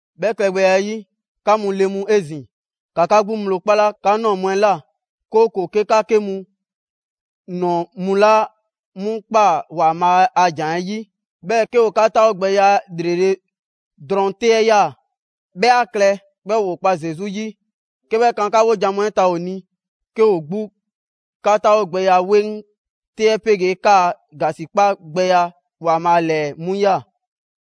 'Bhɛ klɛgbɛya 'ɛ 'yi, 'ka mu le mu 'ezin‑, 'ka 'ka 'gbu ŋgblo 'kpala 'ka ꞊nɔɔ mu 'ɛ 'la, 'kooko‑ 'ke 'ka 'ke mu ꞊nɔɔ mu laa 'mu kpa ‑Waanbhaa' a ‑jan 'ɛ 'yi, 'bhɛɛ‑ 'ke ‑o 'ka 'taawogbɛya ‑lrele' drɔŋ 'te 'ɛ ꞊ya, 'bhɛ 'a klɛ 'bhɛɛ‑ ‑woo kpa Zesu 'yi 'ke 'bhɛ kan 'ka 'wojan‑ mu 'ɛ ta ‑o ni, 'ke ‑o 'gbu 'ka 'taawogbɛya 'weŋ 'te 'ɛ 'pegee 'kaa‑ ‑gasikpa gbɛya ‑Waanbhaa' ‑lɛɛ 'mu ꞊ya.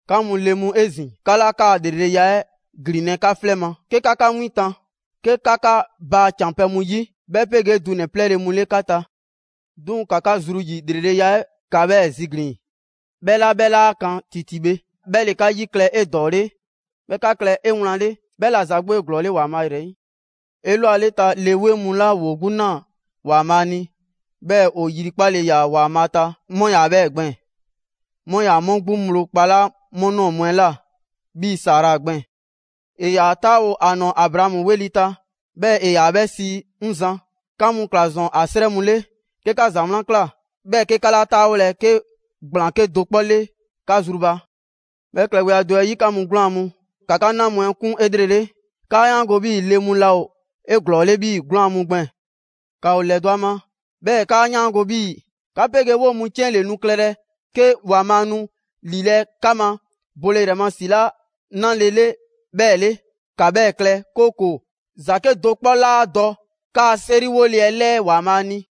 'Ka mu le mu 'ezin‑, 'ka 'laa 'kaa‑ ‑lreleya 'ɛ ‑glinlɛ' 'ka 'flɛ ma, 'ke 'ka 'ka 'win tan, 'ke 'ka 'ka baa ‑can pɛ mu 'yi, 'bhɛ 'pegee dunɛ‑ 'plɛɛle‑ mu 'le 'ka ta. 'Duŋ‑ ‑ka 'ka zru ‑yi ‑lreleya 'ɛ ‑ka 'bhɛɛ‑ ziglin‑; 'bhɛ 'la 'bhɛ 'laa 'kan ‑titi bhe. 'Bhɛ ‑le 'ka 'yi klɛ 'edɔɔle, 'bhɛɛ‑ 'ka klɛ 'ewlanle. 'Bhɛ ‑la ‑za 'gbu ‑o 'eglɔɔle ‑Waanbhaa' ‑yrɛ 'yi. 'Elwaleta le 'weŋ mu 'la ‑woo 'gbu ꞊naa ‑Waanbhaa' ni, 'bhɛɛ‑ ‑o yrikpale ‑yaa' ‑Waanbhaa' ta, 'mu 'yaa‑ 'bhɛɛ‑ gbɛɛn‑. 'Mu 'yaa‑ 'mu 'gbu ŋgblo kpalaa' 'mu ꞊nɔɔ mu 'ɛ ꞊la, 'Bhii‑ Sara gbɛɛn‑. ‑E ‑yaa 'taawo‑ ‑a ‑nɔɔ Abraamu 'weli‑ ta, 'bhɛɛ‑ ‑e ‑yaa 'bhɛ sii: «'Ŋ Zan». 'Ka mu ꞊kla ‑zɔn ‑a 'srɛ mu 'le, 'ke 'ka ‑za 'wlan ꞊kla, 'bhɛɛ‑ 'ke 'ka 'laa 'taawolɛ 'ke ‑gblaan 'kedo‑ 'kpɔ 'le 'ka zru ba. 'Bhɛ klɛgbɛya do 'ɛ 'yi, 'ka mu 'gwlaan‑ mu, ‑ka 'ka 'na mu 'ɛ 'kun 'elrele. ‑Kaa 'yaango 'bhii‑ le mu laa ‑o 'eglɔɔle 'bhii‑ 'gwlaan‑ mu gbɛɛn‑. ‑Ka ‑o ‑lɛdɔ' ‑a ma, 'bhɛɛ‑ ‑kaa 'yaango‑ 'bhii‑ 'ka 'pegee 'woo‑ mu 'ciɛn ‑le nu klɛlɛ 'ke ‑Waanbhaa' nu ‑lilɛ' 'ka ma bole ‑yrɛ ma ‑si 'la 'nale‑ 'le 'bhɛɛ‑ 'le. ‑Ka 'bhɛɛ‑ klɛ, 'kooko‑ ‑za 'kedo‑ 'kpɔ 'laa dɔ 'kaa‑ 'seriwole 'ɛ 'lɛɛ ‑Waanbhaa' ni.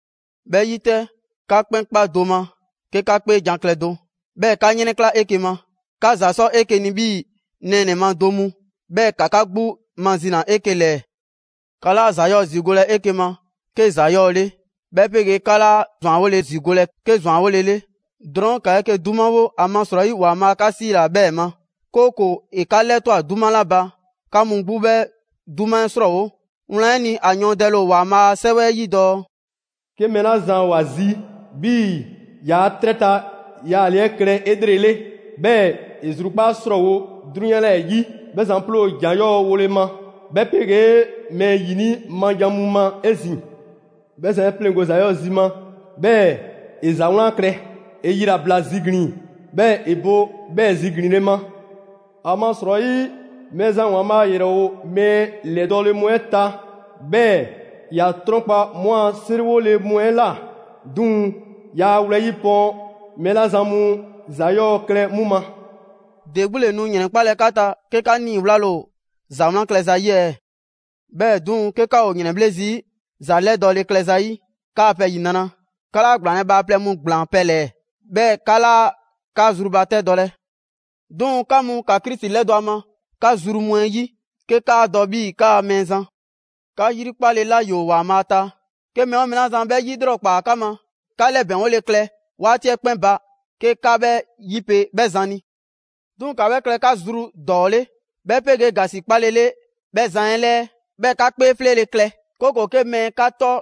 'Bhɛ 'yi 'tɛ, 'ka 'kpɛn 'kpa do ma 'ke 'ka 'kpeejan‑ klɛ do, 'bhɛɛ‑ 'ka 'yrɛnkla‑ 'eke‑ ma. 'Ka ‑za 'sɔ 'eke‑ ni 'bhii‑ nɛɛnɛ‑ ma do mu, 'bhɛɛ‑ ‑ka 'ka 'gbu mazina 'eke‑ ‑lɛɛ. 'Ka 'laa ‑za 'yɔɔ‑ ‑zigolɛ 'eke‑ ma 'ke ‑za 'yɔɔ‑ 'le, 'bhɛ 'pegee 'ka 'laa ‑zwanwole ‑zigolɛ 'ke ‑zwanwole 'le. Drɔɔn' ‑ka 'eke‑ 'dumawole, ‑amasrɔyi ‑Waanbhaa' 'ka 'siila‑ 'bhɛɛ‑ ma, 'kooko‑ ‑e 'ka 'lɛtwa꞊ 'duma 'la ba, 'ka mu 'gbu 'bhɛ 'duma 'ɛ 'srɔɔwo‑. Wlan 'ɛ ni, ‑a yɔɔndɛle ‑o ‑Waanbhaa' a 'Sɛwɛ 'ɛ 'yi dɔɔ: «'Ke mɛɛ 'la zan ‑o ‑a zi 'bhii‑ ‑yaa' 'trɛ ta yaale 'ɛ klɛ 'elrele, 'bhɛɛ‑ ‑e zrukpaa' 'srɔɔwo‑ 'drunyan 'lɛɛ‑ 'yi, 'bhɛ zan 'ploo ‑jan 'yɔɔ‑ wole ma, 'bhɛ 'pegee mɛɛ ‑yini' ma jan mu ma 'ezin‑. 'Bhɛ zan 'e 'pleŋgo‑ ‑za 'yɔɔ‑ zi ma, 'bhɛɛ‑ ‑e ‑za 'wlan klɛ. ‑E yilabla ziglin‑ 'bhɛɛ‑ ‑e bo 'bhɛɛ‑ ziglinle ma. ‑Amasrɔyi Mɛɛzan ‑Waanbhaa' ‑yrɛ ‑o mɛɛ ‑lɛdɔɔle mu 'ɛ ta, 'bhɛɛ‑ ‑ya 'trɔnkpa 'mu a 'seriwole mu 'ɛ ꞊la. 'Duŋ‑ yaa wlɛyi' pɔɔn mɛɛ 'la zan mu ‑za 'yɔɔ‑ klɛ 'mu ma.» ‑De 'gbu ‑le nu ‑yrɛnkpalɛ 'ka ta, 'ke 'ka 'niiwlale ‑o ‑za 'wlan klɛza 'yi ɛɛ? 'Bhɛɛ‑ 'duŋ‑, 'ke 'ka ‑o ‑yrɛnbhle' zii' ‑za 'lɛdɔɔle klɛ ‑zayi', 'kaa‑ pɛ ‑yinra'! 'Ka 'laa ‑gblaanlɛ' bhaaplɛŋ mu ‑gblaanpɛ' ‑lɛɛ, 'bhɛɛ‑ 'ka 'laa 'ka zrubatɛdɔlɛ. 'Duŋ‑, 'ka mu, ‑ka Krisi 'lɛdɔ‑ ‑a ma 'ka zru mu 'ɛ 'yi, 'ke 'kaa dɔ 'bhii‑ ‑kaa Mɛɛzan. 'Ka 'yrikpale 'la ‑yoo ‑Waanbhaa' ta, 'ke mɛɛ 'oo mɛɛ 'la zan 'bhɛ 'yilrɔkpaa 'ka ma, 'ka 'lɛbɛŋgole klɛ 'waati 'ɛ 'kpɛn ba 'ke 'ka 'bhɛ 'yipe 'bhɛ zan ni. 'Duŋ‑, ‑ka 'bhɛ klɛ 'ka zru ‑dɔɔ 'le, 'bhɛ 'pegee ‑gasikpalele 'bhɛ zan 'ɛ ‑lɛɛ. 'Bhɛɛ‑ 'ka 'kpee 'fleele‑ klɛ, 'kooko‑ 'ke mɛɛ 'ka 'tɔ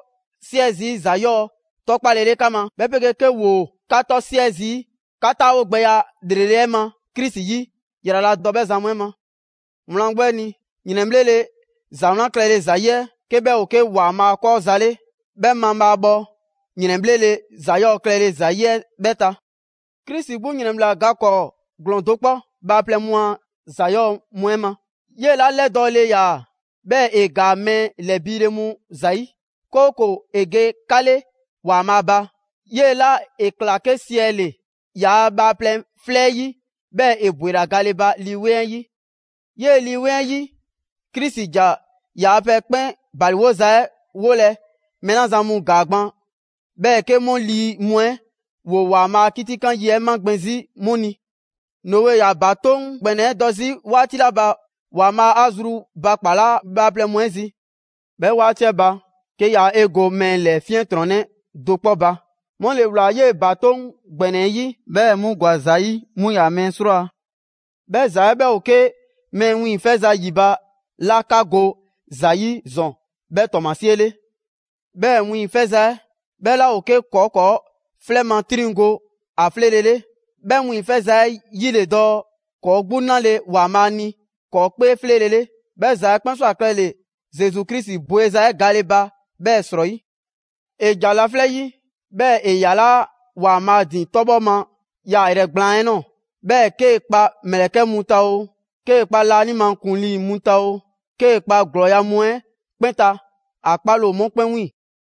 'siɛ zii' ‑za 'yɔɔ‑ 'tɔkpalele 'ka ma, 'bhɛ 'pegee 'ke ‑woo 'ka 'tɔ 'siɛ zii' 'ka taawogbɛya ‑lrele' 'ɛ ma Krisi 'yi, ‑yraladɔ 'bhɛ zan mu 'ɛ ma. Wlan 'gbu 'ɛ ni, ‑yrɛnbhlele ‑za 'wlan klɛle ‑zayi' 'ɛ, 'ke 'bhɛ ‑o 'ke ‑Waanbhaa' 'kɔɔ‑ za 'le, 'bhɛ mabhaabhɔ ‑yrɛnbhlele ‑za 'yɔɔ‑ klɛle ‑zayi' 'ɛ 'bhɛ ta. Krisi 'gbu ‑yrɛnbhla ga 'kɔɔ ‑glɔɔn do 'kpɔ bhaaplɛŋ mu a ‑za 'yɔɔ‑ mu 'ɛ ma. 'Yee‑ 'la 'lɛdɔɔle ‑yaa, 'bhɛɛ‑ ‑e ‑gaa mɛɛ ‑lɛbiile mu ‑zayi', 'kooko‑ ‑e ge 'ka 'le ‑Waanbhaa' ba. 'Yee‑ 'la ‑e ‑kla 'ke siɛ ‑le ‑yaa' bhaaplɛŋ 'flɛ 'ɛ 'yi, 'bhɛɛ‑ ‑e ‑bwela gale ba Lii 'Weŋ 'ɛ 'yi. 'Yee‑ Lii 'Weŋ 'ɛ 'yi, Krisi ‑ja ‑yaa' pɛ 'kpɛn ‑baliwoza 'ɛ 'wolɛ‑ mɛɛ 'la zan mu ‑gaa gban, 'bhɛɛ‑ 'ke 'mu lii mu 'ɛ ‑woo ‑Waanbhaa' a 'kitikan yi 'ɛ magbɛn 'zi, 'mu ni. Noe ‑yaa ‑batoŋ' ‑gbɛnɛ 'ɛ dɔ 'zi 'waati 'la ba Waanbhaa' 'a zrubakpalaa bhaaplɛŋ mu 'ɛ zi. 'Bhɛ 'waati 'ɛ ba, 'ke yaa 'e go mɛɛ ‑lɛ 'fiɛntrɔnnɛ do 'kpɔ ba, 'mu ‑le ꞊wlaa 'yee‑ ‑batoŋ' ‑gbɛnɛ 'ɛ 'yi, 'bhɛɛ‑ 'mu ‑gwa ‑za 'yi: 'mu 'yaa‑ mɛɛ 'srwaa‑. 'Bhɛ ‑za 'ɛ 'bhɛ ‑o 'ke mɛɛ wiiŋfɛza ‑yi ba 'la 'ka go ‑za 'yi ‑zɔn 'bhɛɛ‑ ‑tɔɔmasie 'le. 'Bhɛɛ‑ wiiŋfɛza 'ɛ 'bhɛ 'laa ‑o 'ke ‑kɔɔ' ‑kɔɔ' 'flɛ ma 'triŋ go ‑a 'fɛlele. 'Bhɛ wiiŋfɛza 'ɛ 'yi ‑le dɔɔ ‑kɔɔ' 'gbu 'nale‑ ‑Waanbhaa' ni ‑kɔɔ' 'kpee 'fleele‑ 'le. 'Bhɛ ‑za 'ɛ 'kpɛn ꞊swa klɛle‑ Zesu Krisi bweza 'ɛ gale ba 'bhɛɛ‑ 'srɔyi. ‑E ‑ja laflɛ' 'yi, 'bhɛɛ‑ ‑e ‑yalaa' ‑Waanbhaa' ‑din 'tɔbhɔ ma yaayrɛ gblaan 'ɛ ꞊nɔɔ, 'bhɛɛ‑ 'kee‑ kpa ‑mlɛkɛ' mu ta oo, 'kee‑ kpa laanima ‑kuŋlii mu ta oo, 'kee‑ kpa ‑glɔɔya' mu 'ɛ 'kpɛn ta, ‑a 'kpaale‑ ‑o 'mu 'kpɛn 'wiiŋ‑.